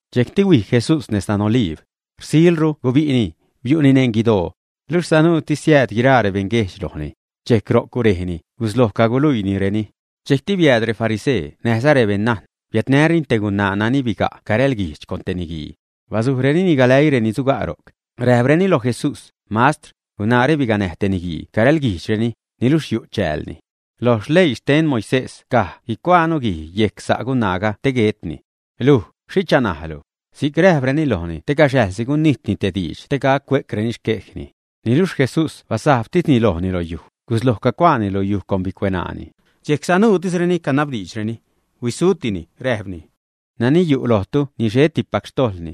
Dxejcti huij Jesús nez dan Oliib. Rsilru gubi'ni, bui'ni neṉ guidoo. Luxh sanuutis siääd guiraa rebeṉguejdx lojni. Dxejc ro'c gurejni, gusloj caguluiinireni. Dxejcti biääd refarisee näjza rebeṉ najn, biädnäreni te gunaa nani biga' carälguijxh con te niguii. Basujrenini galäii reni suga' ro'c. Räjpreni loj Jesús: ―Mastr, gunaare biganäj te niguii carälguijxhreni, niluxh yu' chäälni. Loj leii xten Moisés caj guicuaanu guij yejc sa' gunaaga te guetni. Luj ¿xhicha naalu? Si'c räjpreni lojni te gaxäjsi gunijtni te diidx te gac cue'creni xquejni. Niluxh Jesús basajbtisni lojni lo yuj, gusloj cagucuaani lo yuj con bicueṉaani. Dxejc sanuutisreni canabdiidxreni, huisutini, räjpni: ―Nani yu' lojtu ni xhettipac xtojḻni,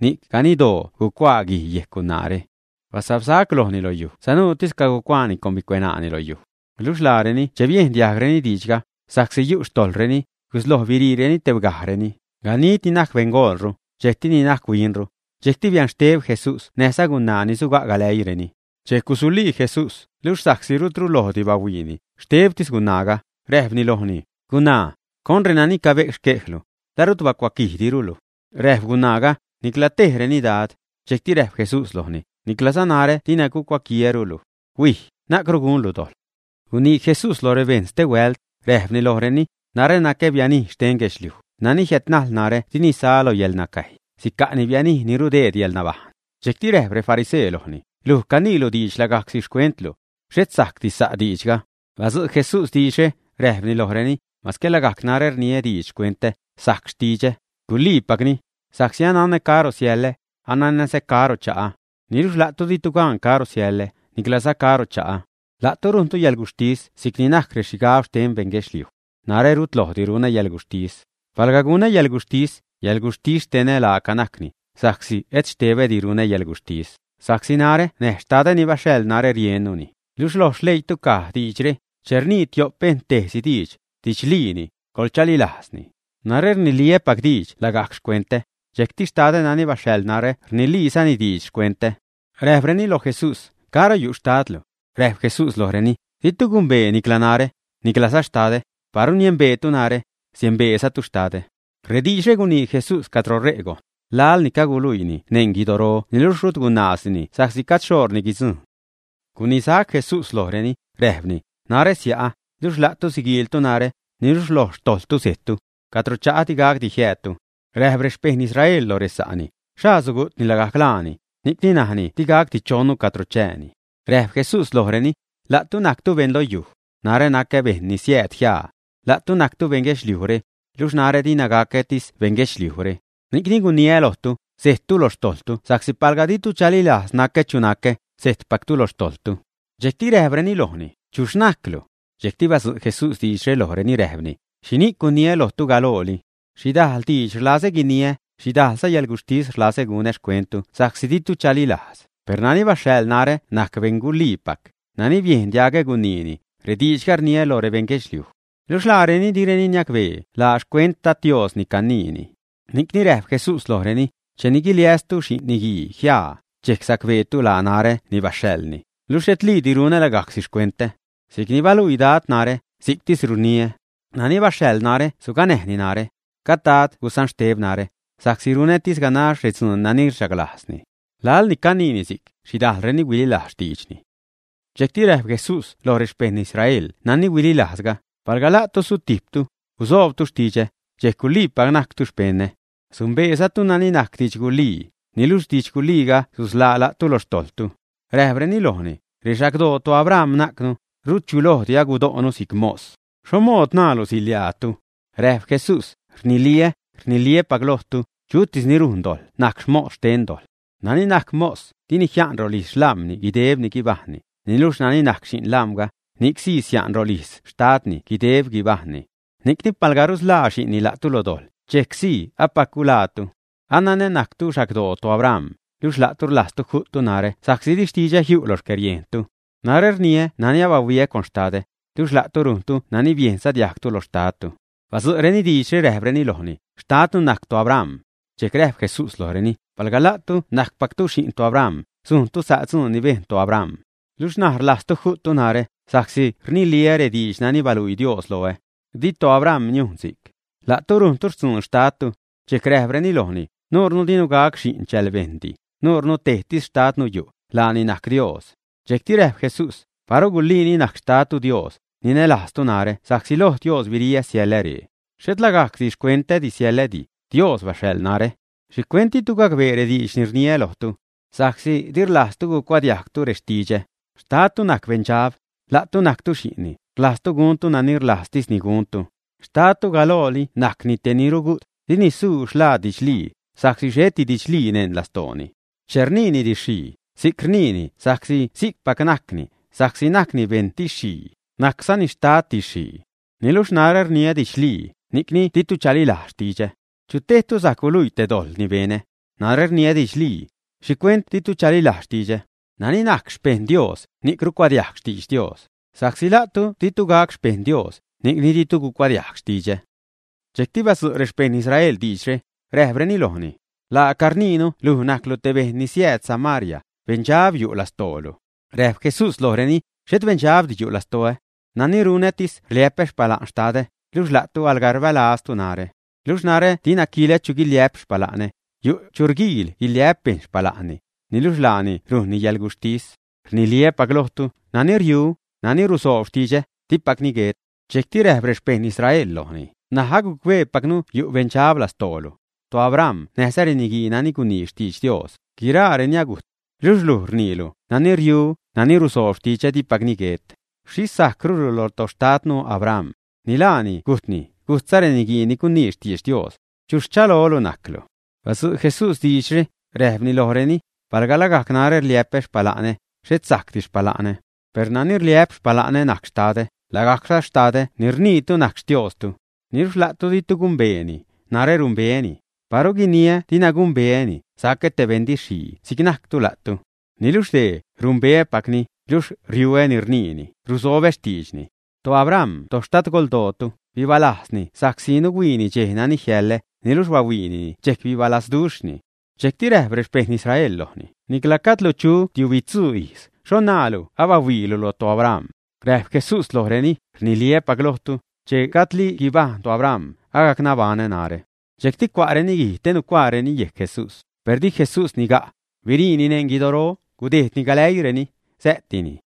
ni'c ganiddoo sugucuaani guij yejc gunaare. Basabsac lojni lo yuj sanuutis cagucuaani con bicueṉaani lo yuj. Luxh laareni che biejn diajgreni diidxga, sa'csi yu' xtojḻreni, gusloj biriireni tebgajreni, ganid ni najc beṉgolru, dxejcti ni najc huinru. Dxejcti bianxteb Jesús näjza gunaa ni suga' galäiireni. Dxejc gusulii Jesús, luxh sa'csi rutru lojdi bahuiini, xtebtis gunaaga, räjpni lojni: ―Gunaa, ¿con reni cabe'c xquejlu? ¿La rut bacuaquijdiru luj, ä? Räjp Gunaaga: ―Nicla tejreni, Dad. Dxejcti räjp Jesús lojni: ―Niclaza narä dina gucuaquiäru luj. Huij, na'cru gunlu dojḻ. Gunii Jesús lo rebejṉ stehuält, räjpni lojreni: ―Narä nacä bianij xten guedxliuj; nani jiädnajl narä dini sa lo yäḻnacäjy, sica'ni bianij ni rudeedpac yäḻnabajṉ. Dxejcti räjp refarisee lojni: ―Luj caniilu diidx lagajcsi xcuentlu. Xhet sajcdi sa' diidxga. Badzu' Jesús diidxre, räjpni lojreni: ―Masque lagajc narä rniä diidx xcuentä, sajc xtidxä, guliipacni, sa'csi ananä caro siälä, ananäza caro cha'ä. Niluxh la'tu ditu gan caro siälä, niclaza caro cha'ä. La'tu rujntu yäḻguxhtis si'c najctis rexhigab xten beṉ guedxliuj. Narä rut lojdi runä yäḻguxhtis. Palga gunä yäḻguxhtis, yäḻguxhtis xtenä laaca najcni, sa'csi et xtebädi runä yäḻguxhtis, sa'csi narä näj Xtadä ni baxhaḻ narä rieṉnuni. Luxh lo xleiitu caj diidxre: “Che rnii tio'p bejṉ tejsi diidx, didxliini, coḻchalilajzni.” Narä rniliä́pac diidx lagajc xcuentä, dxejcti Xtadä nani baxhaḻ narä rniliizani diidx xcuentä. Räjpreni loj Jesús: ―¿Caro yu' xtadlu? Räjp Jesús lojreni: ―Ditu gumbee nicla narä, niclaza Xtadä; paru niembeetu narä, niembeezatu Xtadä. Rediidxre gunii Jesús cadro ṟe' gojn, laḻ ni caguluiini neṉ guidoro niluxh rut gunaazdini sa'csi gajd xhoṟni guidzujṉ. Gunisac Jesús lojreni, räjpni: ―Narä sia'ä, luxh la'tu siguiiltu narä, niluxh loj xtojḻtu sejttu. Cadro cha'ä di gacdi jiäädtu. Räjp rexpejṉ Israel loj resa'reni: ―¿Xhaa sugu'tni lagajc laani, ni'cni najni di gacdi chonnu cadro chääni? Räjp Jesús lojreni: ―La'tu najctu beṉ lo yuj. Narä nacä beṉ ni siääd jiaa. La'tu najctu beṉ guedxliujre. Luxh narä dina gacätis beṉ guedxliujre. Ni'cni guniä lojtu, sejttu lo xtojḻtu sa'csi palga ditu chalilajz nacä chu nacä, sejtpactu lo xtojḻtu. Dxejcti räjpreni lojni: ―¿Chuxh najclu? Dxejcti badzu' Jesús diidxre lojreni, räjpni: ―¿Xhini'c guniä lojtu galooli? Xhidajl diidx rlazä guiniä, xhidajlza yäḻguxhtis rlazä gunä xcuenttu sa'csi ditu chalilajz, per nani baxhaḻ narä najc beṉ guliipac; nani biejn diagä guniini, rediidxga rniä loj rebeṉ guedxliuj. Luxh laareni direni niacbee la xcuent Dad Dios ni caniini. Ni'cni räjp Jesús lojreni: ―Cheni guiliästu Xi'n Niguii jiaa, dxejc sacbeetu laa narä ni baxhaḻni, luxh xhetliidi runä lagajcsi xcuentä. Si'cni baluii Dad narä, si'ctis rniä. Nani baxhaḻ narä suganäjni narä. Gajd Dad gusanxteb narä, sa'csi runätis ganax redzuun nani rchaglajzni. Laḻ ni caniini si'c, xhidajlreni huililajz xtiidxni. Dxejcti räjp Jesús lo rexpejṉ Israel nani huililajzga: ―Palga la'tu sutijptu, guzoobtu xtidxä, dxejc guliipac najctu xpeṉä. Sumbeezatu nani najc didxgulii, niluxh didx guliiga susḻaa la'tu lo xtojḻtu. Räjpreni lojni: ―Rexagdoo toAbraham najcnu, rut chu lojdi gudo'nu si'c mos. ¿Xho mood naalu “siḻiaatu”? Räjp Jesús: ―Riniliä́, rniliä́pac lojtu, chutis ni rujn dojḻ najc mos xten dojḻ. Nani najc mos, dini jia'n rolijz xlam̲ni guideb guibajṉni, niluxh nani najc xi'n lam̲ga, ni'c sii sia'n rolijz xtadni guideb guibajṉni. Ni'cni, palga rusḻaa xi'nni la'tu lo dojḻ, dxejcsii apac guḻaatu. Ananä najctu xagdoo toAbraham, luxh la'tu rlajztu ju'ttu narä sa'csi di xtidxä jiu' lo xcäriejntu. Narä rniä nani abahuiä con Xtadä; luxh la'tu rujntu nani biejnza diajgtu lo xtadtu. Badzu'reni diidxre, räjpreni lojni: ―Xtadnu najc toAbraham. Dxejc räjp Jesús lojreni: ―Palga la'tu najcpactu xi'n toAbraham, sujntu sa' dzuun ni bejn toAbraham. Luxh ṉaj rlajztu ju'ttu narä, sa'csi rniliä rediidx nani baluii Dios loä. ¡Di toAbraham niujn si'c! La'tu rujntu xtzuun xtadtu. Dxejc räjpreni lojni: ―Nuure dinu gac xi'n chälbejṉdi; nuure tejtis xtadnu yu', laani najc Dios. Dxejcti räjp Jesús: ―Paru guliini najc xtadtu Dios, ninälajztu narä sa'csi loj Dios biriä siäḻä ree. Xhet lagajcsi xcuentä siäḻädi; Dios baxhaḻ narä. ¿Xhicuent ditu gacbee rediidx ni rniä lojtu? Sa'csi di rlajztu gucuadiajgtu rextidxä. Xtadtu najc beṉdxab. La'tu najctu xi'nni, rlajztu guntu nani rlajztisni guntu. Xtadtu galooli najcni te ni rugu't, dini suu xlaad didxlii, sa'csi xheti didxlii neṉ lastooni. Che rniini didx-xhii, si'c rniini sa'csi si'cpac najcni, sa'csi najcni beṉ didx-xhii, najczani xtad didx-xhii. Niluxh narä rniä didxlii, ni'c ditu chalilajz xtidxä. ¿Chu tejtu sajc guluii te dojḻ ni benä? Narä rniä didxlii. ¿Xhicuent ditu chalilajz xtidxä, ä? Nani najc xpejṉ Dios, ni'c rucuadiajg xtidx Dios. Sa'csi la'tu ditu gac xpejṉ Dios, ni'cni ditu gucuadiajg xtidxä. Dxejcti badzu' rexpejṉ Israel diidxre, räjpreni lojni: ―Laaca rniinu luj najclu te bejṉ ni siääd Samaria, beṉdxab yu' lastoolu. Räjp Jesús lojreni: ―Xhet beṉdxabdi yu' lastoä. Nani runätis rliä'pä xpala'n Xtadä, luxh la'tu alga rbälaztu narä. Luxh narä dina quilä chu guiliä'p xpala'nä, yu' chu rguiil guiliä'p bejṉ xpala'nä, niluxh laani rujnni yalguxhtis. Rniliä́pac lojtu, nani riu, nani rusoob xtidxä, dipacni guet. Dxejcti räjp rexpejṉ Israel lojni: ―N̲aj agucbeepacnu yu' beṉdxab lastoolu. ToAbraham näjza reniguii nani gunii xtidx Dios, guiraareni agujt. Luxh luj rniilu: “Nani riu, nani ruzoob xtidxä, dipacni guet.” ¿Xhixh sajcrulu lo toxtadnu Abraham, ä? Ni laani gujtni, gujtza reniguii ni gunii xtidx Dios. ¿Chuxh rchalolu najclu? Badzu' Jesús diidxre, räjpni lojreni: ―Palga lagajc narä rliä'pä xpala'nä, xhet sajcdi xpala'nä. Per nani rliä'p xpala'nä najc Xtadä, lagajcza Xtadä ni rniitu najc Xtiostu. Niluxh la'tu ditu gumbeeni. Narä numbeäni. Paru guiniä dina gumbeäni, sacä te beṉ didx-xhii si'c najctu la'tu. Niluxh dee, numbeäpacni, luxh riuä ni rniini, rusobä xtiidxni. ToAbraham toxtadgoldootu, bibalajzni sa'csi nuhuiini dxej nani jiäḻä, niluxh bahuiinini dxejc bibalazduxhni. Dxejcti räjp rexpejṉ Israel lojni: ―Nicla gajdlu chu tiubitzuu ijz, ¿xho naalu abahuiilu lo toAbraham? Räjp Jesús lojreni: ―Rniliä́pac lojtu, che gajdli guibajṉ toAbraham, agac nabaṉä narä. Dxejcti cua'reni guij te nucuaareni yejc Jesús, per di Jesús niga', biriini neṉ guidoro, gudejdni galäiireni. Sä'tini.